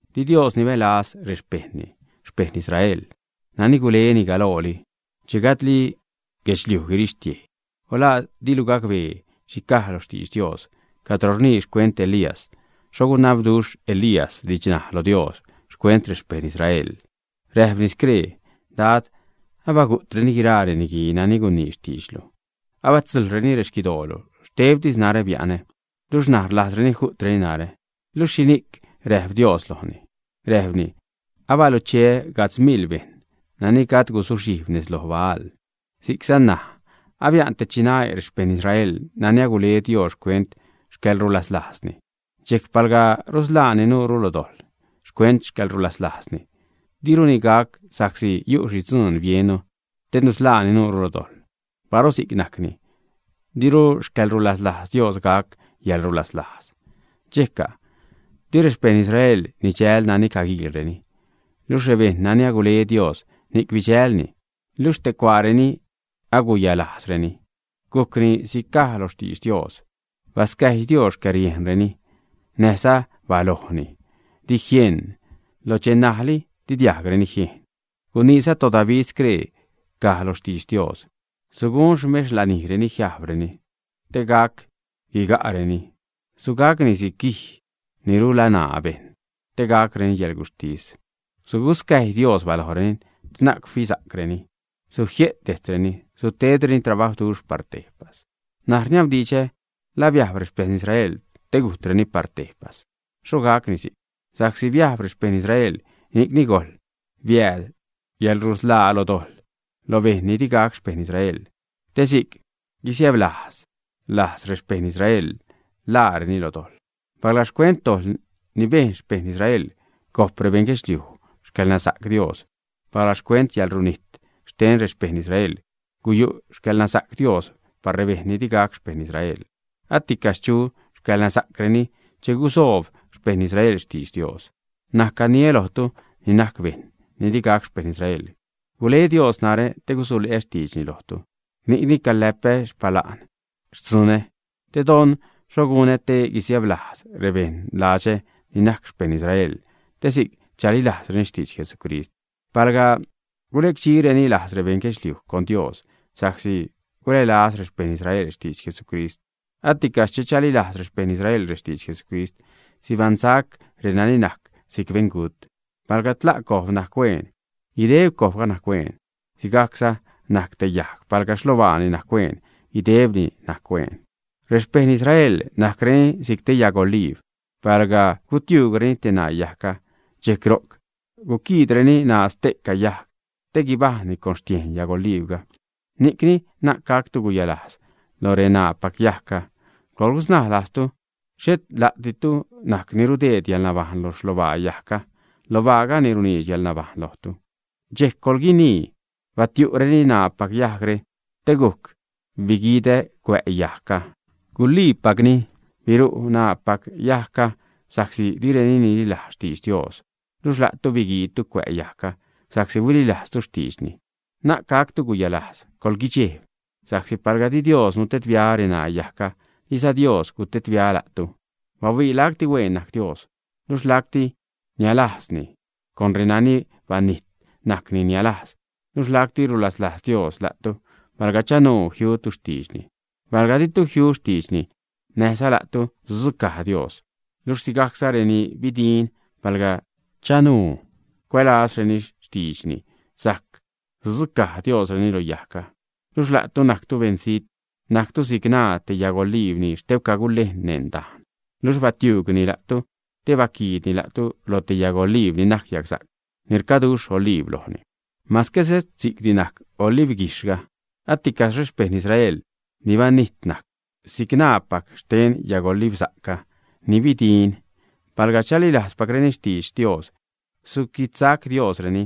Di Dios nibälaz rexpejṉni, xpeṉ Israel nani guleni galooli che gajdli guirixtiej guedxliuj. O ¿la dilu gacbee xhi caj lo xtidx Dios cadro rnii xcuent Elías, xho gunabduxh Elías didxnaj lo Dios xcuent rexpeṉ Israel, ä? Räjpni scree: “Dad, abagu'treni guiraa reniguii nani gunii xtiidxlu, abatzujḻreni rexquidoolu, xtebtis narä bia'nä, luxh ṉaj rlajzreni ju'treni narä.” Luxh, ¿xhini'c räjp Dios lojni? Räjpni: “Abalucheä gajdz miḻ bejṉ nani gajd guzuxhijb nez loj Baal.” Si'cza ṉaj, abia'n te chinae' rexpeṉ Israel nani agule Dios xcuent xcäḻrulaslajzni. Dxejc palga rusḻaani nuure lo dojḻ xcuent xcäḻrulaslajzni diruni gac sa'csi yu' xhi dzuun biennu te nusḻaani nuure lo dojḻ. Paru si'c najcni diru xcäḻrulaslajz Dios gac yäḻrulaslajz. ¿Dxejca'? Di rexpeṉ Israel nidxäl nani caguiilreni, luxh rebejṉ nani agule Dios, ni'c bidxälni, luxh ste cuaareni, aguyalajzreni. Gujcni si'c caj lo xtidx Dios: Bascäjy Dios xcäriejnreni, näjza balojni di jieṉ, lo dxe ṉajli di diajgreni jiejn. Guniiza toDavid, scree caj lo xtidx Dios: Sugun xmex lanijreni jiajbreni, te gac guiga'reni, sugacni si'c guij ni rulani' bejṉ, te gacreni yäḻguxhtis. Suguscäjy Dios balojreni te na'c fisa'creni, sujie't dejtzreni, sutedreni trabajwduxh par tejpas. N̲aj rniabdidxä: ¿La biajb rexpeṉ Israel te gunijtreni par tejpas, ä? ¡Xho gacni si'c! Sa'csi biajb rexpejṉ Israel, ni'cni gojl biääd yäḻrusḻaa lo dojḻ lo bejṉ ni di gac xpeṉ Israel, te si'c guisiäblajz lajz rexpeṉ Israel ḻaareni lo dojḻ. Palga xcuent dojḻ ni bejn xpeṉ Israel gojp rebeṉ guedxliuj xcäḻnasa'c Dios, palga xcuent yäḻrunijt xten rexpeṉ Israel guyu' xcäḻnasa'c Dios par rebejṉ ni di gac xpeṉ Israel, aticaxh chu xcäḻnasa'creni che gusoob xpeṉ Israel xtidx Dios. N̲aj caniä lojtu ni najc bejṉ ni di gac xpejṉ Israel. Gule Dios narä te gusule'ä xtiidxni lojtu, ni'cni caläpä xpala'n xtzunä, te don xho gunä te guisiäblajz rebeṉ ladxä ni najc xpeṉ Israel, te si'c chalilajzreni xtidx Jesucrist. Palga gulecdxireni lajz rebeṉ guedxliuj con Dios sa'csi gulälaz rexpeṉ Israel xtidx Jesucrist, aticaxh che chalilajz rexpeṉ Israel rextidx Jesucrist, sibaṉsac renani najc si'c beṉgut. Palga tla' cojb najc hueen, guideb cojbga najc hueen. Sigajcza najc te yajg; palga xlobaani najc hueen, guidebni najc hueen. Rexpeṉ Israel najcreni si'c te yajg oliib; palga gutiuugreni te ṉaa yajgga, dxejc ro'c guquiidreni ṉaa ste'ca yajg te guibajṉni con xtiejn yajg oliibga. Ni'cni, na'c gactu guyalajz lo reṉaapac yajgga. Coḻgusnaj lajztu, xhet la'ditu ni rudeed yäḻnabajṉ lo xlobaa yajgga, lobaaga ni runiidx yäḻnabajṉ lojtu. Dxejc coḻguinii: “Batiuugreni ṉaapac yajgre, te gujc biguidä cuä' yajgga.” Guliipacni, biru' ṉaapac yajgga sa'csi direni nililajz xtidx Dios luxh la'tu biguiidtu cuä' yajgga sa'csi huililajztu xtiidxni. Na'c gactu guyalajz, coḻguidxejb, sa'csi palga di Dios nutedbia reṉaa yajgga, diza Dios gutedbia la'tu. Bahuii ¡lacti hueen najc Dios! Luxh lacti niälajzzani; con renani banijt najcni niälajz, luxh lacti rulaslajz Dios la'tu palga chanuu jiutu xtiidxni. Palga ditu jiu xtiidxni, näjza la'tu sudzucaj Dios. Luxh sigajcza reni bidin, palga di chanuu cuälazreni xtiidxni sajc suquidsac Diosreni lo yajgga. Luxh la'tu najctu beṉzijt, najctu si'c ṉaa te yagoliib ni xtebca gulejn neṉ dajn. Luxh batiuugni la'tu te baquiidni la'tu lo te yagoliib ni najc yagsa'c ni rcaduxh oliib lojni, mase xhet si'cti najc olibguijxhga, ¡aticaxh rexpeṉ Israel ni banijt najc si'c ṉaapac xten yagolibsa'cga ni bidin, palga chalilajzpacreni xtidx Dios, suquidsac Diosreni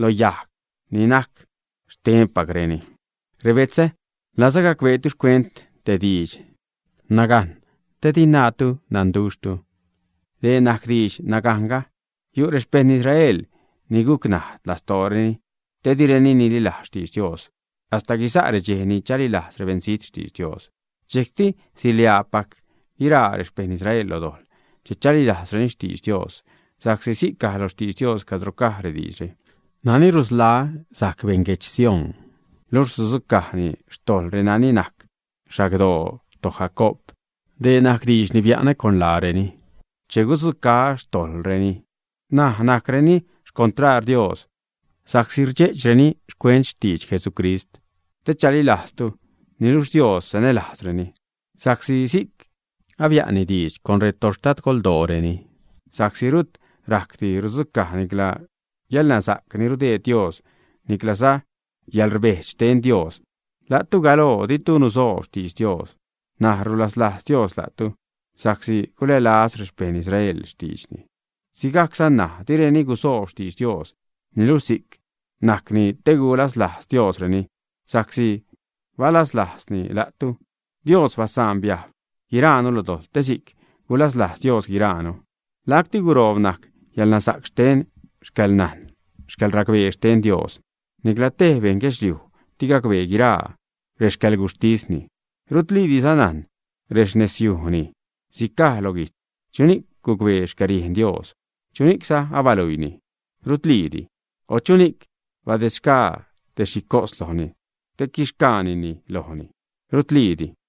loj yajg ni najc xtenpacreni! Rebetzä, rlazä gacbeetu xcuent te diidx nagajn, te di naatu nanduxhtu. Dee najc didx nagajnga: yu' rexpejṉ Israel ni guc najd lastooreni te direni nililajz xtidx Dios, hasta guisa' redxej ni chalilajz rebeṉzijt xtidx Dios. Dxejcti siḻiaapac guiraa rexpeṉ Israel lo dojḻ che chalilajzreni xtidx Dios, sa'csi si'c caj lo xtidx Dios, cadro caj rediidxre: Nani rusḻaa sajc beṉ guedx Sión, luxh sudzucajni xtojḻ renani najc xagdoo toJacoob. Dee najc diidx ni bia'nä con laareni, che gudzucaä xtojḻreni. N̲aj, najcreni xcontraar Dios sa'csi rdxe'chreni xcuent xtidx Jesucrist, te chalilajztu; niluxh Dios sanälajzreni sa'csi si'c abia'nni diidx con retoxtadgoldooreni. Sa'csi rut rajcdi rudzucaj nicla yäḻnasa'c ni rudeed Dios, niclaza yäḻrbejdx xten Dios. La'tu galoo ditu nusoob xitdx Dios. N̲aj rulaslajz Dios la'tu sa'csi gulälaz rexpeṉ Israel xtiidxni. Sigajcza ṉaj direni gusoob xtidx Dios, niluxh si'c najcni te gulaslajz Diosreni sa'csi balaslajzzani la'tu. Dios basaan biajb guiraanu lo dojḻ, te si'c sajc gulaslajz Dios guiraanu. ¡Lacti guroob najc yäḻnasa'c xten xcäḻnajn, xcäḻracbee xten Dios! Nicla tej bejṉ guedxliuj di gacbee guiraa rexcäḻguxhtisni, rudliidiza najn rexnezyujni. Si'c caj lo guijtz: “¿Chuni'c gucbee xcäriejn Dios? ¿Chuni'cza abaluiini? Rutliidi. O ¿chuni'c badedxgaa te xhi cos lojni, te quixsacnini lojni, ä? Rutliidi.”